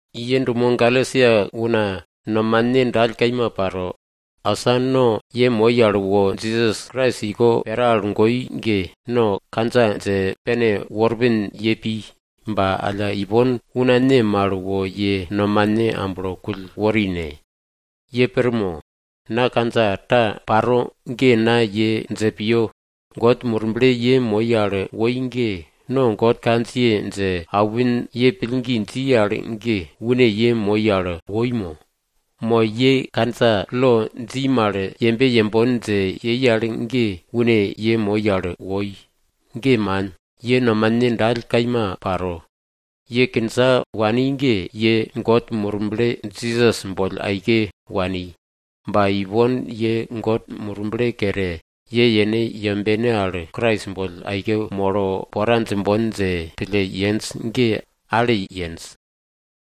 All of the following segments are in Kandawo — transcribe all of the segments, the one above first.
Ye dumo Galesia una nomane dall kaima paro. Asa no ye moi al wo, Jisas Krais iko pera al goi mal ge no kandja dje pene worpin ye pi, ba alla ipon una ne mal wo ye nomane amblo kull wori ne? Pir mo? Na kandja ta paro ge na ye dje piyo. God Murble ye moi al woi ge, no God kandjiye dje aupin ye pillgi dji al ge, une ye moi al woi mo? Mo ye kandja lo dji mal yembe yembon dje yei al ge une ye moi al woi? Ge man! Ye nomane dall kaima paro. Ye kindja wani poke ge, ye God Murble Jisas boll aike wani, ba ipon ye God Murble kere, ye yene yembene al Krais boll aike molo pora djimbon dje pille yenj ge, ale yenj.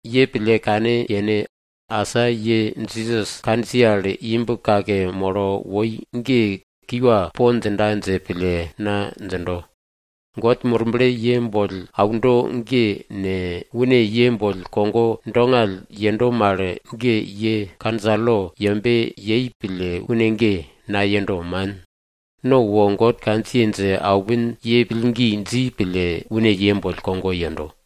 Ye pille kane yene, asa ye Jisas kandjiye al imb kake molo woi ge kiwa po djinda dje pille na djindo. God Murble ye boll aundo ge ne, une ye boll kogo dongall yendo mal ge, ye kandja lo yembe yei pille une ge nayendo, man. No wo God kandjiye dje aupin, ye pillgi dji pille une ye boll kogo yendo.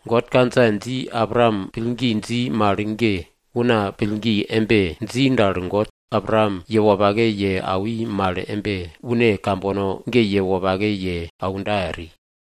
God kandja dji Abraam pillgi dji mal ge, una pillgi embe dji dal, God Abraam ye wopake ye awi mal embe, une kambono ge ye wopake ye aunda eri.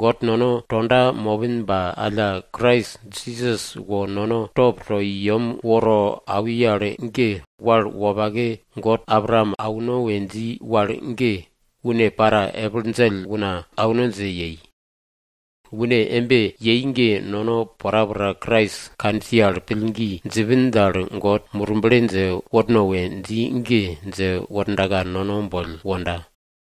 God nono tonda mopin ba alla, Krais Jisas wo nono top to i yem woro awi al ge, wal wopake God Abraam auno we dji wal ge, une para epil djell una auno dje yei. Une embe yei ge nono porapora Krais kandjiye al pillgi djipin dal, God Murble dje worno we dji ge dje wordaka nono boll wonda.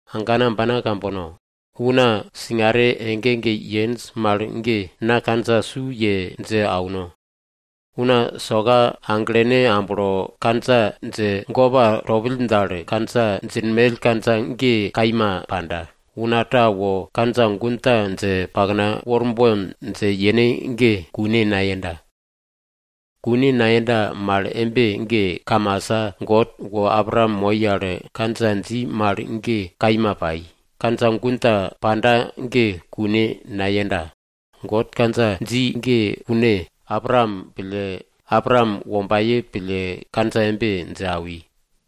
Agana ambana kambono! Una singare ege ege yenj mal ge na kandja su ye dje auno. Una soka aglene amblo kandja dje gopa topill dal, kandja djinmell kandja ge kaima panda. Una ta wo kandja gun ta dje pakna worbon dje yene ge, kune nayenda. Kune nayenda mal embe ge, kamasa God wo Abraam moi al kandja dji mal ge kaima pai, kandja gun ta panda ge kune nayenda. God kandja dji ge une Abraam pille, Abraam wombaye pille kandja embe dje awi.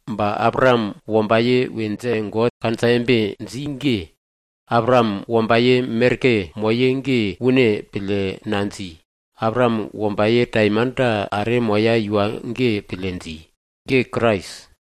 Ba Abraam wombaye we dje God kandja embe dji ge, Abraam wombaye merke moye ge une pille nadji. Abraam wombaye taimanta are moya iwa ge pille dji. Ge Krais.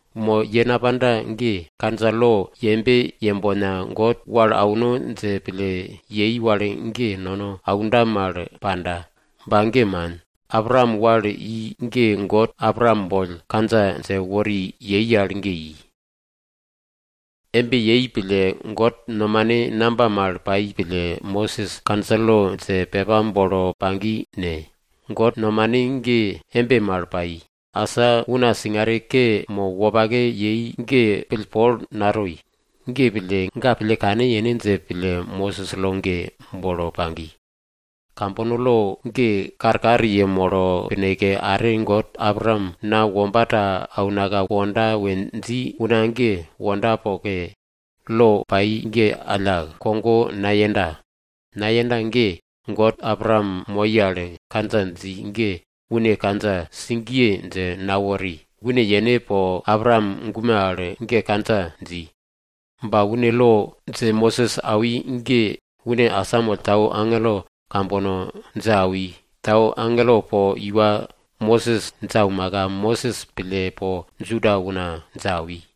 Mo ye napanda ge, kandja lo yembe yembona, God wal auno dje pille yei wal ge nono aunda mal panda. Ba ge man, Abraam wal i ge God Abraam boll kandja dje wori yei al ge i. Embe yei pille, God nomane namba mal pai pille Mosis kandja lo dje pepa bolo pagi ne? God nomane ge embe mal pai. Asa una singare ke mo wopake yei ge pillpol natoi. Ge pille, ga pille kane yene dje pille, Mosis lo ge bolo pagi. Kambono lo ge karkar yemolo pineke, are God Abraam na womba ta aunaka wonda we dji una ge wonda poke, lo pai ge alla kogo nayenda. Nayenda ge God Abraam moi al kandja dji ge une kandja sigiye dje nawori. Une yene po Abraam gume al ge kandja dji. Ba une lo dje Mosis awi ge une asamoll tau agelo kambono dje awi, tau agelo po iwa Mosis dje aumaka, Mosis pille po Juda una dje awi.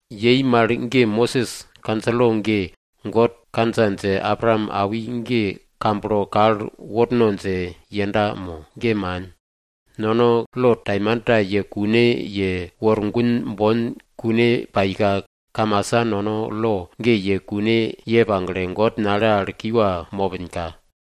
Yei mal ge, Mosis kandja lo ge, God kandja dje Abraam awi ge kamblo kal worno dje yenda mo? Ge man! Nono lo taimanta ye kune ye wor gun bon kune paika, kamasa nono lo ge ye kune ye pagle, God nale al kiwa mopinka.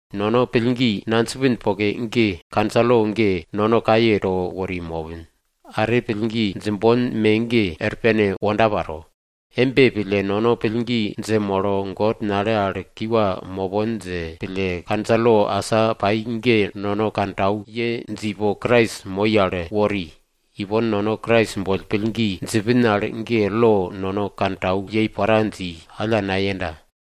Nono pillgi nadjipin poke ge, kandja lo ge nono kaye to wori mopin, are pillgi djimbon me ge, er pene wonda paro. Embe pille, nono pillgi dje molo God nale al kiwa mopon dje pille, kandja lo asa pai ge nono kantau ye dje ipo Krais moi al wori. Ipon nono Krais boll pillgi djipin al ge, lo nono kantau yei pora dji, alla nayenda.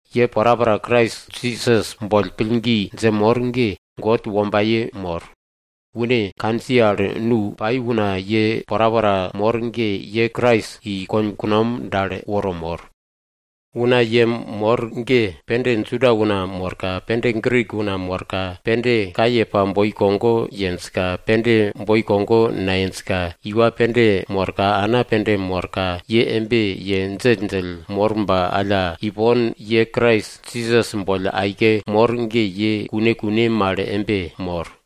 Ye porapora Krais Jisas boll pillgi dje mor ge, God wombaye mor. Une kandjiye al nu pai una ye porapora mor ge, ye Krais i konkunom dal woro mor. Una ye mor ge, pende Juda una morka, pende Grik una morka, pende kaye pa boi kogo yenjka, pende boi kogo nayenjka, iwa pende morka, ana pende morka, ye embe ye djelldjell mor ba alla ipon ye Krais Jisas boll aike mor ge, ye kune kune mal embe mor.